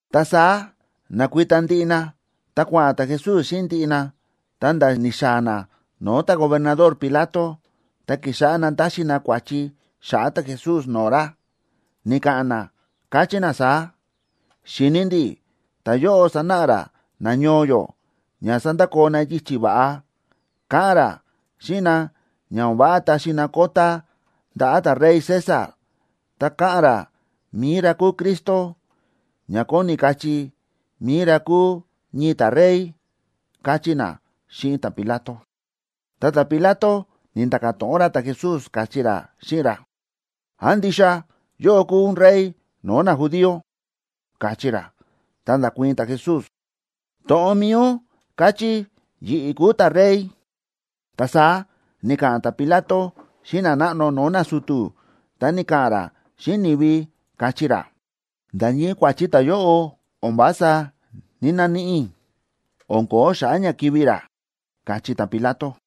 Ta saá na̱kuita ndiꞌi na, ta kua̱ꞌa̱n ta̱Jesús xíꞌin ndiꞌi na, ta̱nda̱ ni̱xaa̱ na no̱o̱ ta̱gobernador Pilato. Ta ki̱xáꞌá na táxi na kua̱chi xa̱ꞌa̱ ta̱Jesús no̱o̱ ra, ni̱ka̱ꞌa̱n na, káchí na saá: ―Xi̱ni ndi̱ ta̱yóꞌo sánáꞌa ra nañoo yó ña sandakoo na yichi̱ va̱ꞌa. Káꞌa̱n ra xíꞌin na ña o̱n váꞌa taxi na kota ndaꞌa̱ ta̱rey César. Ta káꞌa̱n ra mi̱i ra kúu Cristo, ña kóni kachí mi̱i ra kúu ñii ta̱rey ―káchí na xíꞌin ta̱Pilato. Ta ta̱Pilato ni̱nda̱ka̱ to̱ꞌon ra ta̱Jesús, káchí ra xíꞌin ra: ―¿Án ndixa yóꞌó kúu ún rey no̱o̱ najudío? ―káchí ra. Ta nda̱kuii̱n ta̱Jesús: ―To̱ꞌon mi̱i ún káchí yi̱ꞌi̱ kúu ta̱rey. Ta saá ni̱ka̱ꞌa̱n ta̱Pilato xíꞌin nanáꞌno no̱o̱ nasu̱tu̱, ta ni̱ka̱ꞌa̱n ra xíꞌin ni̱vi, káchí ra: ―Nda̱ ñii kua̱chi ta̱yóꞌo o̱n vása ní‑naníꞌi i̱, o̱n ko̱ó xa̱ꞌa̱ ña kivi̱ ra ―káchí ta̱Pilato.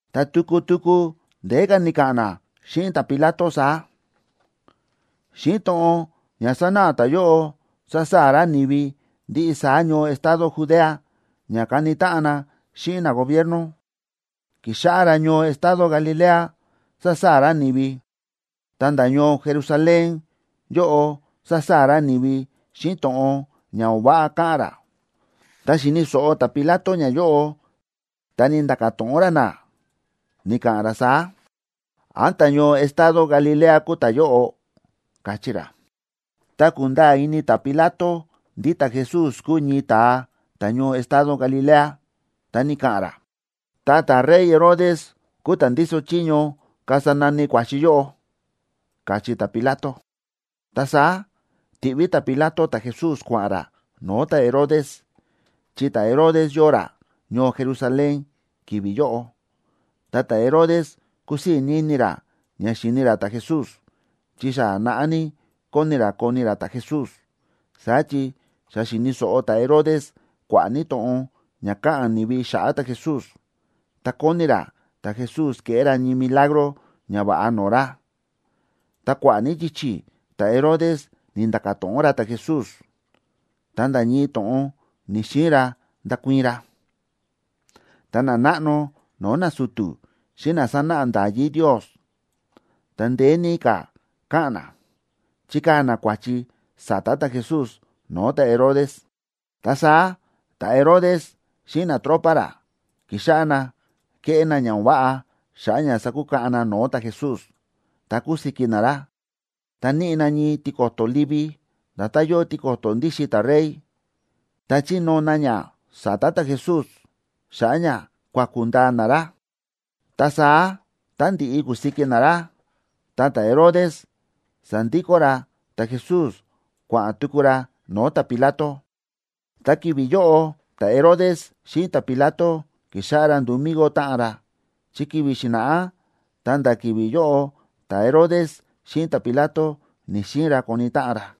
Ta tuku tuku ndeé ka̱ ni̱ka̱ꞌa̱n na xíꞌin ta̱Pilato saá: ―Xíꞌin to̱ꞌon ña sánáꞌa ta̱yóꞌo sásaa̱ ra ni̱vi ndiꞌi saá ñoo estado Judea ña kani táꞌan na xíꞌin nagobierno. Ki̱xáꞌá ra ñoo estado Galilea sásaa̱ ra ni̱vi, ta̱nda̱ ñoo Jerusalén yóꞌo sásaa̱ ra ni̱vi xíꞌin to̱ꞌon ña o̱n váꞌa káꞌa̱n ra. Tá xi̱ni̱ so̱ꞌo ta̱Pilato ñayóꞌo, ta ni̱nda̱ka̱ to̱ꞌon ra na, ni̱ka̱ꞌa̱n ra saá: ―¿Án ta̱ñoo estado Galilea kúu ta̱yóꞌo? ―káchí ra. Tá ku̱nda̱a̱ ini ta̱Pilato ndí ta̱Jesús kúu ñii ta̱a ta̱ñoo estado Galilea, ta ni̱ka̱ꞌa̱n ra: ―Ta ta̱rey Herodes kúu ta̱ ndíso chiño kasa nani kua̱chi yóꞌo ―káchí ta̱Pilato. Ta saá ti̱ꞌví ta̱Pilato ta̱Jesús kua̱ꞌa̱n ra no̱o̱ ta̱Herodes, chi ta̱Herodes yóo ra ñoo Jerusalén ki̱vi̱ yóꞌo. Ta ta̱Herodes kúsii̱ ní ini ra ña xíni ra ta̱Jesús, chi xa naꞌá ní kóni ní ra koni ra ta̱Jesús. Saá chi xa xi̱ni̱ so̱ꞌo ta̱Herodes kua̱ꞌa̱ ní to̱ꞌon ña káꞌa̱n ni̱vi xa̱ꞌa̱ ta̱Jesús, ta kóni ra ta̱Jesús keꞌé ra ñii milagro ñava̱ꞌa no̱o̱ ra. Ta kua̱ꞌa̱ ní yichi̱ ta̱Herodes ni̱nda̱ka̱ to̱ꞌon ra ta̱Jesús, ta nda̱ ñii to̱ꞌon ni̱‑xiin ra ndakuii̱n ra. Ta nanáꞌno no̱o̱ nasu̱tu̱ xíꞌin na sánáꞌa nda̱yí Ndios, ta ndeé ní ka̱ káꞌa̱n na, chíkaa̱ na kua̱chi sa̱ta̱ ta̱Jesús no̱o̱ ta̱Herodes. Ta saá ta̱Herodes xíꞌin natropa ra ki̱xáꞌá na kéꞌé na ña o̱n váꞌa xa̱ꞌa̱ ña sakukaꞌan na no̱o̱ ta̱Jesús, ta ku̱siki na ra. Ta níꞌi na ñii tiko̱to̱ livi, nda̱tán yóo tiko̱to̱ ndíxin ta̱rey, ta chi̱nóo na ña sa̱ta̱ ta̱Jesús xa̱ꞌa̱ ña kuaku̱ ndaa na ra. Ta saá tá ndi̱ꞌi ku̱siki na ra, ta ta̱Herodes sa̱ndikó ra ta̱Jesús kua̱ꞌa̱n tuku ra no̱o̱ ta̱Pilato. Ta ki̱vi̱ yóꞌo ta̱Herodes xíꞌin ta̱Pilato ki̱xáꞌá ra nduu migo táꞌan ra, chi ki̱vi̱ xi̱na̱ꞌá ta̱nda̱ ki̱vi̱ yóꞌo ta̱Herodes xíꞌin ta̱Pilato ni̱‑xiin ra koni táꞌan ra.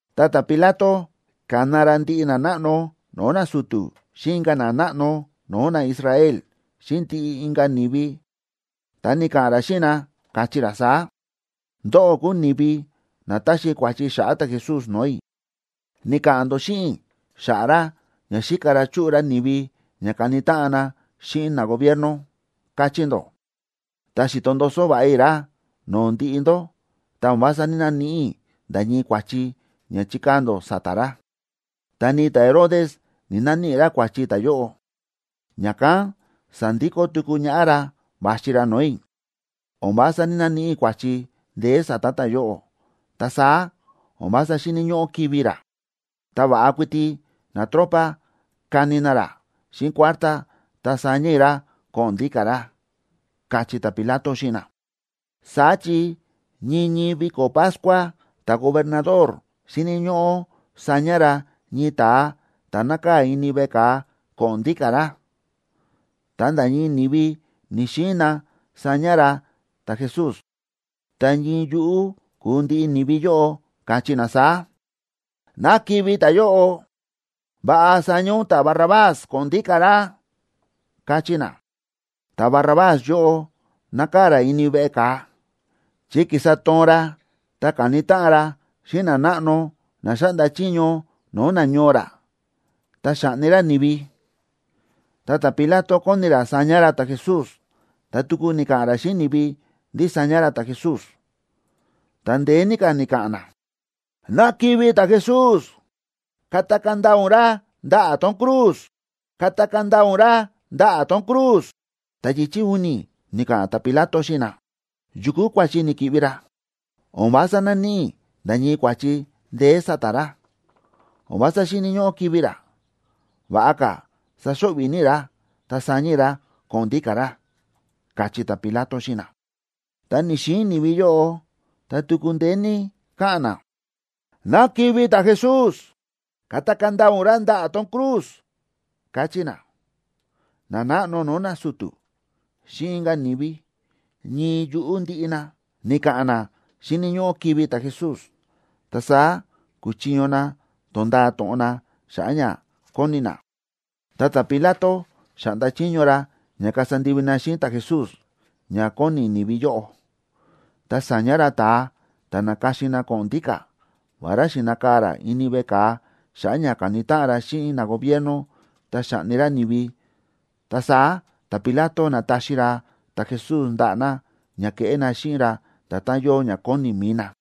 Ta ta̱Pilato ka̱na ra ndiꞌi nanáꞌno no̱o̱ nasu̱tu̱ xíꞌin inka̱ nanáꞌno no̱o̱ naIsrael xíꞌin ndiꞌi inka̱ ni̱vi, ta ni̱ka̱ꞌa̱n ra xíꞌin na, káchí ra saá: ―Ndóꞌó kúu ni̱vi na ta̱xi kua̱chi xa̱ꞌa̱ ta̱Jesús no̱o̱ i̱. Ni̱ka̱ꞌa̱n ndó xíꞌin i̱ xa̱ꞌa̱ ra ña xíka ra chúꞌu ra ni̱vi ña kani táꞌan na xíꞌin nagobierno, káchí ndó. Ta xi̱to ndoso va̱ꞌa i̱ ra no̱o̱ ndiꞌi ndó, ta o̱n vása ní‑naníꞌi i̱ nda̱ ñii kua̱chi ña chi̱kaa̱ ndó sa̱ta̱ ra. Ta ni ta̱Herodes ni̱‑naníꞌi ra kua̱chi ta̱yóꞌo, ña̱kán sa̱ndikó tuku ñaꞌá ra va̱xi ra no̱o̱ i̱. O̱n vása ní‑naníꞌi i̱ kua̱chi ndeé sa̱ta̱ ta̱yóꞌo, ta saá o̱n vása xíni̱ ñóꞌó kivi̱ ra. Ta va̱ꞌa kuiti natropa kani na ra xíꞌin kuártá, ta saña i̱ ra ko̱ꞌo̱n ndíka̱ ra ―káchí ta̱Pilato xíꞌin na. Saá chi ñii ñii viko̱ Pascua ta̱gobernador xíni̱ ñóꞌó saña ra ñii ta̱a ta̱ nákaa̱ ini veꞌe ka̱a, ko̱ꞌo̱n ndíka̱ ra. Ta nda̱ ñii ni̱vi ni̱‑xiin na saña ra ta̱Jesús, ta ñii yuꞌú kúu ndiꞌi ni̱vi yóꞌo, káchí na saá: ―¡Ná kivi̱ ta̱yóꞌo! ¡Va̱ꞌa saña ún ta̱Barrabás ko̱ꞌo̱n ndíka̱ ra! ―káchí na. Ta̱Barrabás yóꞌo nákaa̱ ra ini veꞌe ka̱a, chi ki̱sa toon ra ta ka̱ni táꞌan ra xíꞌin nanáꞌno na xáꞌnda chiño no̱o̱ nañoo ra, ta xa̱ꞌni ra ni̱vi. Ta ta̱Pilato kóni ra saña ra ta̱Jesús, ta tuku ni̱ka̱ꞌa̱n ra xíꞌin ni̱vi ndí saña ra ta̱Jesús. Ta ndeé ní ka̱ ni̱ka̱ꞌa̱n na: ―¡Ná kivi̱ ta̱Jesús! ¡Katakaa̱ ndaa ún ra ndaꞌa̱ tón cruz! ¡Katakaa̱ ndaa ún ra ndaꞌa̱ tón cruz! Ta yichi̱ u̱ni̱ ni̱ka̱ꞌa̱n ta̱Pilato xíꞌin na: ―¿Yu kúu kua̱chi ni̱ki̱ꞌvi ra? O̱n vása náníꞌi i̱ nda̱ ñii kua̱chi ndeé sa̱ta̱ ra, o̱n vása xíni̱ ñóꞌó kivi̱ ra. Va̱ꞌa ka̱ saxo̱ꞌvi̱ ní i̱ ra, ta saña i̱ ra ko̱ꞌo̱n ndíka̱ ra ―káchí ta̱Pilato xíꞌin na. Ta ni̱‑xiin ni̱vi yóꞌo, ta tuku ndeé ní káꞌa̱n na: ―¡Ná kivi̱ ta̱Jesús! ¡Katakaa̱ ndaa ún ra ndaꞌa̱ tón cruz! ―káchí na. Nanáꞌno no̱o̱ nasu̱tu̱ xíꞌin inka̱ ni̱vi, ñii yuꞌú ndiꞌi na, ni̱ka̱ꞌa̱n na xíni̱ ñóꞌó kivi̱ ta̱Jesús. Ta saá ku̱chiño na to̱nda̱a to̱ꞌon na xa̱ꞌa̱ ña kóni na. Ta ta̱Pilato xa̱ꞌnda chiño ra ña kasa ndivi na xíꞌin ta̱Jesús ña kóni ni̱vi yóꞌo. Ta sa̱ña ra ta̱a ta̱ na̱ka̱xin na ko̱ꞌo̱n ndíka̱, vará xi̱nakaa̱ ra ini veꞌe ka̱a xa̱ꞌa̱ ña ka̱ni táꞌan ra xíꞌin nagobierno, ta xa̱ꞌni ra ni̱vi. Ta saá ta̱Pilato na̱taxi ra ta̱Jesús ndaꞌa̱ na ña keꞌé na xíꞌin ra nda̱tán yóo ña kóni mi̱i na.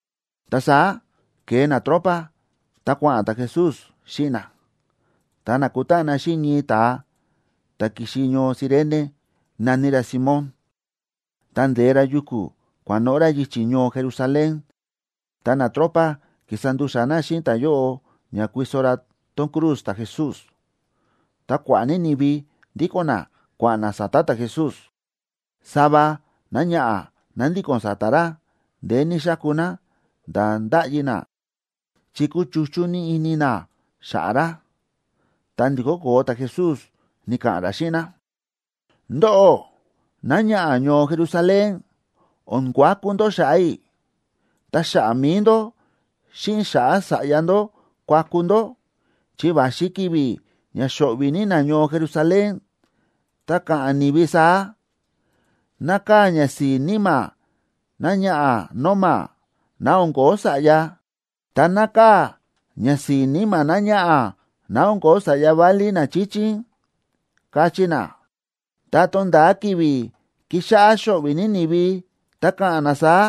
Ta saá ke̱e natropa, ta kua̱ꞌa̱n ta̱Jesús xíꞌin na, ta na̱kutáꞌan na xíꞌin ñii ta̱a ta̱ ki̱xi ñoo Cirene, na̱ní ra Simón, ta nde̱e ra yuku̱ kua̱noꞌo̱ ra yichi̱ ñoo Jerusalén, ta natropa ki̱sa ndu̱xa̱ na xíꞌin ta̱yóꞌo ña kuiso ra tón cruz ta̱Jesús. Ta kua̱ꞌa̱ ní ni̱vi ndíko̱n na kua̱ꞌa̱n na sa̱ta̱ ta̱Jesús. Sava náñaꞌa̱ ná ndíko̱n sa̱ta̱ ra, ndeé ní xáku ná, nda̱ ndáꞌyi ná, chi kúchuchú ní ini ná xa̱ꞌa̱ ra. Ta ndi̱kó koo ta̱Jesús, ni̱ka̱ꞌa̱n ra xíꞌin ná: ―Ndóꞌó, náñaꞌa̱ ñoo Jerusalén, o̱n kuaku ndó xa̱ꞌa̱ i̱, ta xa̱ꞌa̱ mi̱i ndó, xíꞌin xa̱ꞌa̱ sa̱ꞌya ndó kuaku ndó. Chi va̱xi ki̱vi̱ ña xo̱ꞌvi̱ ní nañoo Jerusalén, ta ka̱ꞌa̱n ni̱vi saá: “Nákaa̱ ñasi̱i̱ níma̱ náñaꞌa̱ nóma, ná o̱n ko̱ó sa̱ꞌya, ta nákaa̱ ñasi̱i̱ níma̱ náñaꞌa̱ ná o̱n ko̱ó sa̱ꞌya válí na chíchín”, kachí na. Tá tonda̱a ki̱vi̱ kixáꞌá xo̱ꞌvi̱ ní ni̱vi, ta ka̱ꞌa̱n na saá: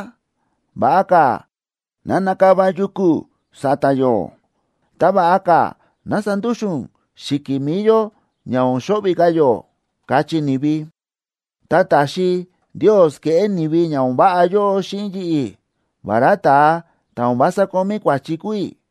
“Va̱ꞌa ka̱ ná nakava yuku̱ sa̱ta̱ yó, ta va̱ꞌa ka̱ ná sandúxu̱n xi̱ki̱ mi̱i yó ña o̱n xo̱ꞌvi̱ ka̱ yó”, kachí ni̱vi. Tá taxi Ndios keꞌé ni̱vi ña o̱n váꞌa yóꞌo xíꞌin yi̱ꞌi̱, vará ta̱a ta̱ o̱n vása kómí kua̱chi kúu i̱,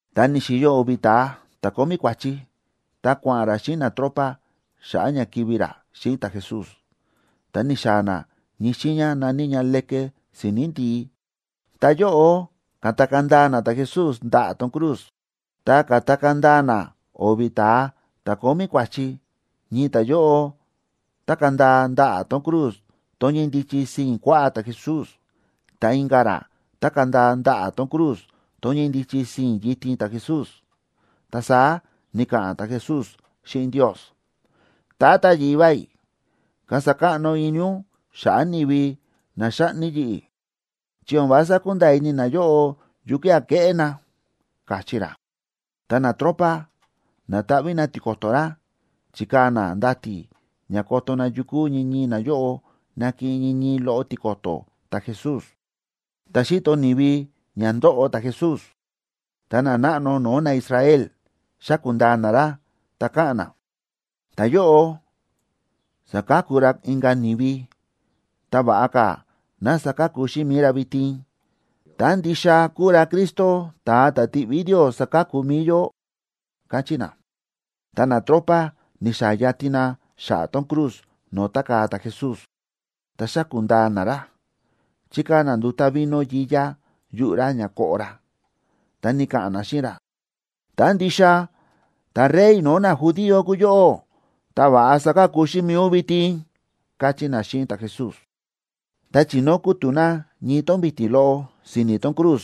Ta ni̱xi̱yo o̱vi̱ ta̱a ta̱ kómí kua̱chi, ta kua̱ꞌa̱n ra xíꞌin natropa xa̱ꞌa̱ ña kivi̱ ra xíꞌin ta̱Jesús. Ta ni̱xaa̱ na ñii xiiña na̱ní ña Leke Si̱ni̱ Ndi̱í, ta yóꞌo ka̱takaa̱ ndaa na ta̱Jesús ndaꞌa̱ tón cruz. Ta ka̱takaa̱ ndaa na o̱vi̱ ta̱a ta̱ kómí kua̱chi, ñii ta̱yóꞌo tákaa̱ ndaa ndaꞌa̱ tón cruz tón ñíndichi sii̱n kuaꞌá ta̱Jesús, ta inka̱ ra tákaa̱ ndaa ndaꞌa̱ tón cruz tón ñíndichi sii̱n yitin ta̱Jesús. Ta saá ni̱ka̱ꞌa̱n ta̱Jesús xíꞌin Ndios: ―Tata Yivá i̱, kasa káꞌno ini ún xa̱ꞌa̱ ni̱vi na xáꞌni yi̱ꞌi̱, chi o̱n vása kúnda̱a̱ ini nayóꞌo yukía̱ kéꞌé na ―káchí ra. Ta natropa na̱taꞌví na tiko̱to̱ ra, chi̱kaa̱ na ndati̱ ña koto na yukú ñii ñii nayóꞌo nakiꞌin ñii ñii loꞌo tiko̱to̱ ta̱Jesús. Ta xíto ni̱vi ña ndóꞌo ta̱Jesús, ta nanáꞌno no̱o̱ naIsrael xáku̱ ndaa na ra, ta káꞌa̱n na: ―Ta̱yóꞌo sa̱ka̱ku ra inka̱ ni̱vi. Ta va̱ꞌa ka̱ ná saka̱ku xíꞌin mi̱i ra vitin, tá ndixa kúu ra Cristo, ta̱a ta̱ ti̱ꞌví Ndios saka̱ku mi̱i yó ―káchí na. Ta natropa ni̱xaa̱ yatin na xa̱ꞌa̱ tón cruz no̱o̱ tákaa̱ ta̱Jesús, ta xa̱ku̱ ndaa na ra. Chi̱kaa̱ na nduta̱ vino yiyá yuꞌu̱ ra ña koꞌo ra, ta ni̱ka̱ꞌa̱n na xíꞌin ra: ―Tá ndixa ta̱Rey no̱o̱ najudío kúu yóꞌó, ta va̱ꞌa saka̱ku xíꞌin mi̱i ún vitin ―káchí na xíꞌin ta̱Jesús. Ta chi̱nóo kútu̱ na ñii tón vi̱ti̱ loꞌo si̱ni̱ tón cruz.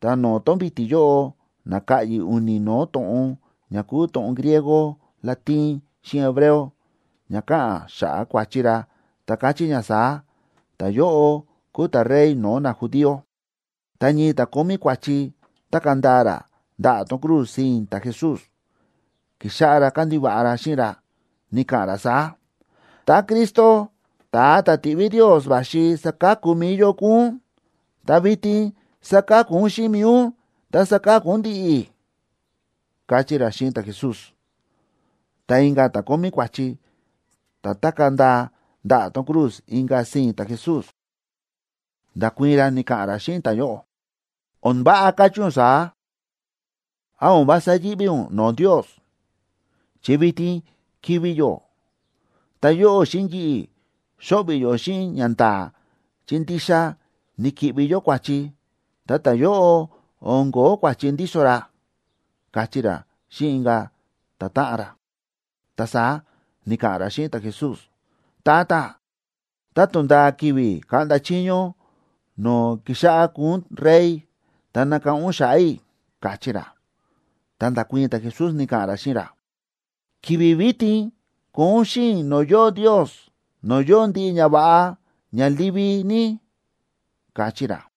Ta no̱o̱ tón vi̱ti̱ yóꞌo na̱ka̱ꞌyi̱ u̱ni̱ no̱o̱ to̱ꞌon ña kúu to̱ꞌon griego, latín, xíꞌin hebreo, ña káꞌa̱n xa̱ꞌa̱ kua̱chi ra, ta káchí ña saá: “Ta̱yóꞌo kúu ta̱Rey no̱o̱ najudío.” Ta ñii ta̱ kómí kua̱chi, tákaa̱ ndaa ra ndaꞌa̱ tón cruz sii̱n ta̱Jesús, ki̱xáꞌá ra kándiva̱ꞌa ra xíꞌin ra, ni̱ka̱ꞌa̱n ra saá: ―Tá Cristo, ta̱a ta̱ ti̱ꞌví Ndios va̱xi saka̱ku mi̱i yó kúu ún, ta vitin saka̱ku xíꞌin mi̱i ún ta saka̱ku ún ndi̱ꞌi̱ ―káchí ra xíꞌin ta̱Jesús. Ta inka̱ ta̱ kómí kua̱chi, ta̱ tákaa̱ ndaa ndaꞌa̱ tón cruz inka̱ sii̱n ta̱Jesús, nda̱kuii̱n ra ni̱ka̱ꞌa̱n ra xíꞌin ta̱yóꞌo: ―¡O̱n váꞌa káchí ún saá! ¿Án o̱n vása yíꞌví ún no̱o̱ Ndios?, chi vitin kivi̱ yó. Ta yóꞌó xíꞌin yi̱ꞌi̱, xo̱ꞌvi̱ yó xíꞌin ñanda̱a̱, chi ndixa ni̱ki̱ꞌvi yó kua̱chi. Ta ta̱yóꞌo, o̱n ko̱ó kua̱chi ndíso ra ―káchí ra xíꞌin inka̱ ta̱táꞌan ra. Ta saá ni̱ka̱ꞌa̱n ra xíꞌin ta̱Jesús: ―Tata, tá tonda̱a ki̱vi̱ kaꞌnda chiño ún no̱o̱ kixáꞌá kuu ún rey, ta nakáꞌán ún xa̱ꞌa̱ i̱ ―káchí ra. Ta nda̱kuii̱n ta̱Jesús, ni̱ka̱ꞌa̱n ra xíꞌin ra: ―Ki̱vi̱ vitin koo ún xíꞌin i̱ no̱o̱ yóo Ndios, no̱o̱ yóo ndiꞌi ñava̱ꞌa ña livi ní ―káchí ra.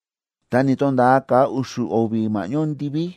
Ta ni̱to̱nda̱a ka̱a u̱xu̱ o̱vi̱ ma̱ꞌñó ndiví,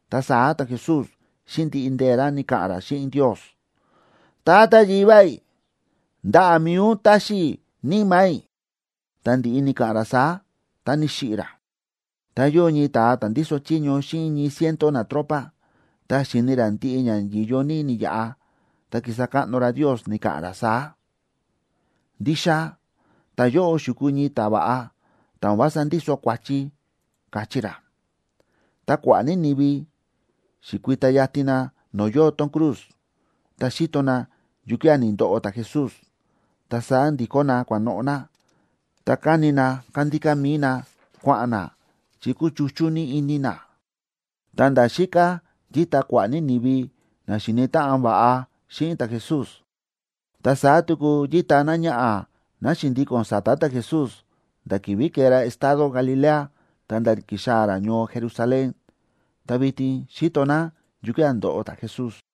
Ta saá ta̱Jesús xíꞌin ndiꞌi ndee̱ ra ni̱ka̱ꞌa̱n ra xíꞌin Ndios: ―Tata Yivá i̱, ndaꞌa̱ mi̱i ún táxi i̱ níma̱ i̱. Ta ndi̱ꞌi ni̱ka̱ꞌa̱n ra saá, ta ni̱xiꞌi̱ ra. Ta yóo ñii ta̱a ta̱ ndíso chiño xíꞌin ñii ciento natropa, ta xi̱ni̱ ra ndiꞌi ña yi̱yo ní ni̱yaꞌa, ta ki̱sa káꞌno ra Ndios, ni̱ka̱ꞌa̱n ra saá: ―Ndixa ta̱yóꞌo xi̱kuu ñii ta̱va̱ꞌa, ta̱ o̱n vása ndíso kua̱chi ―káchí ra. Ta kua̱ꞌa̱ ní ni̱vi xi̱kui̱ta yatin na no̱o̱ yóo tón cruz, ta xi̱to na yukía̱ ni̱ndoꞌo ta̱Jesús. Ta saá ndi̱kó na kua̱noꞌo̱ na, ta káni na kándíká mi̱i na kua̱ꞌa̱n na, chi kúchuchú ní ini na. Ta nda̱ xíká yíta kua̱ꞌa̱ ní ni̱vi na xíni̱ táꞌan va̱ꞌa xíꞌin ta̱Jesús, ta saá tuku yíta náñaꞌa̱ ná xi̱ndíko̱n sa̱ta̱ ta̱Jesús, nda̱ ki̱vi̱ ke̱e ra estado Galilea ta̱nda̱ ki̱xaa̱ ra ñoo Jerusalén, ta vitin xíto ná yukía̱ ndóꞌo ta̱Jesús.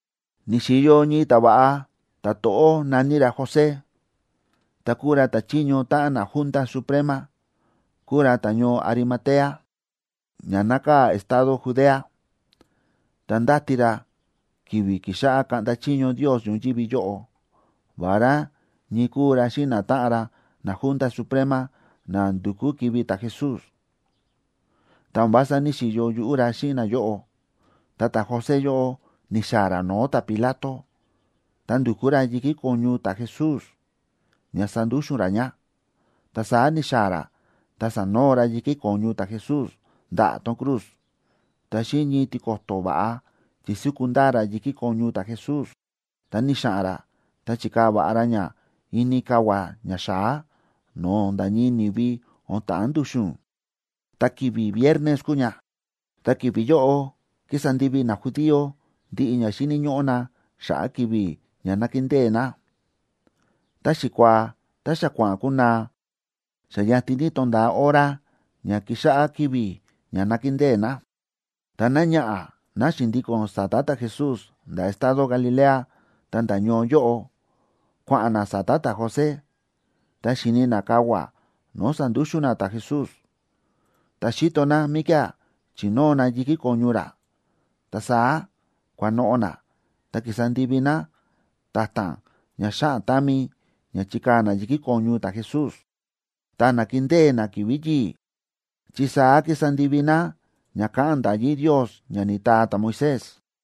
Ni̱xi̱yo ñii ta̱va̱ꞌa ta̱to̱ꞌó, na̱ní ra José, ta kúu ra ta̱chiño táꞌan naJunta Suprema. Kúu ra ta̱ñoo Arimatea, ña nákaa̱ estado Judea. Ta ndáti ra ki̱vi̱ kixáꞌá kaꞌnda chiño Ndios ñoyívi yóꞌo. Vará ñii kúu ra xíꞌin natáꞌan ra naJunta Suprema na ndu̱kú kivi̱ ta̱Jesús, ta o̱n vása ní‑xiyo yuꞌú ra xíꞌin nayóꞌo. Ta ta̱José yóꞌo ni̱xa̱ꞌa̱n ra no̱o̱ ta̱Pilato, ta ndu̱kú ra yi̱kí ko̱ñu ta̱Jesús ña sandúxu̱n ra ña. Ta saá ni̱xaa̱ ra ta sa̱noo ra yi̱kí ko̱ñu ta̱Jesús ndaꞌa̱ tón cruz, ta xíꞌin ñii tiko̱to̱ va̱ꞌa chi̱súku ndaa ra yi̱kí ko̱ñu ta̱Jesús. Ta ni̱xa̱ꞌa̱n ra ta chi̱kaa̱ va̱ꞌa ra ña ini kavua̱ ñaxa̱á, no̱o̱ nda̱ ñii ni̱vi o̱n ta̱ꞌán ndu̱xu̱n. Ta ki̱vi̱ viernes kúu ña, ta ki̱vi̱ yóꞌo kísa ndivi najudío ndiꞌi ña xíni̱ ñóꞌó na xa̱ꞌa̱ ki̱vi̱ ña nákindée na. Ta xikuaa ta xa kua̱ꞌa̱n kunaa, xa yatin ní tonda̱a hora ña kixáꞌá ki̱vi̱ ña nakindée na. Ta náñaꞌa̱, ná xi̱ndíko̱n sa̱ta̱ ta̱Jesús nda̱ estado Galilea ta̱nda̱ ñoo yóꞌo, kua̱ꞌa̱n ná sa̱ta̱ ta̱José, ta xi̱ni̱ ná kavua̱ no̱o̱ sa̱ndúxu̱n na ta̱Jesús, ta xi̱to ná míkía̱ chi̱nóo na yi̱kí ko̱ñu ra. Ta saá kua̱noꞌo̱ ná ta ki̱sa ndivi ná ta̱ta̱n ña xáꞌan támi ña chikaa̱ ná yi̱kí ko̱ñu ta̱Jesús. Ta na̱kindée ná ki̱vi̱ yi̱i̱, chi saá ki̱sa ndivi ná ña káꞌa̱n nda̱yí Ndios ña ni̱taa ta̱Moisés.